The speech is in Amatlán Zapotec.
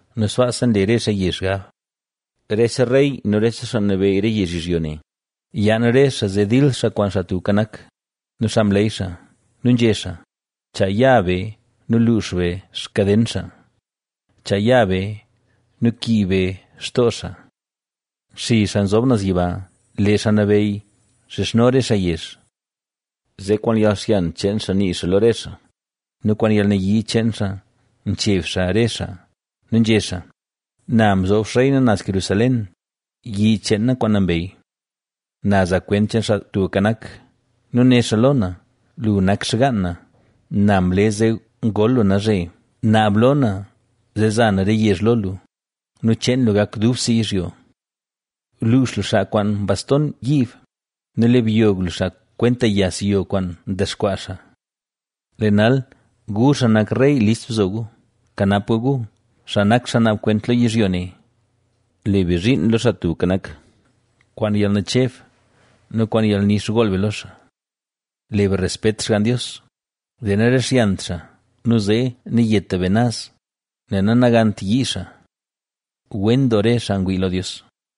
nu sbaasa nle re xaa yezh xgab. Rese rey nu rese xaa nabeyy re yezh yizhyo ne, yaan re xaa zee dil xaa kwaan Xaa Tubka Nak nu xaa mleey xaa. Nu nzhé xaa: ¡Chaa ya be nu luux be xkaden xaa! ¡Chaa ya be nu kiib be xtoo xaa! Nxizh Xaa Nzob Naz Yiba, lee Xaa Nabeyy nxizhno re xaa yezh. Zee kwaan yalxyan cheen xaa nii xaa lo re xaa nu kwaan yalnayii cheen xaa ncheb xaa re xaa nu nzhé xaa: “Na mzoob xrey na naz Jerusalén, yi cheen na kwaan nambey”. Na za kwent cheen Xaa Tubka Nak nu né xaa lo na: “Lu nak xgaan na, na mle zee ngol lu nalzhe. Naab lo na, zee za na re yezh lo lu nu cheen lu gak dubse yizhyo, Luux lu xaa kwaan baston yiib nu le byog lu xaa kwenta yas yo kwaan ndexkwaa xaa.” Lee nal, gu xaa nak rey, list bzo gu, kanap gu gu, xaa nak xaa naab kwent lo yizhyo ne. Le be zhiin lo Xaa Tubka Nak, kwaan yalnacheb nu kwaan yalnix gool be lo xaa. Le be respet xgann Dios, zee narixyant xaa nu zee nayeta be naz, nel nanagant yii xaa. ¡Wen doo re xaa ngwii lo Dios!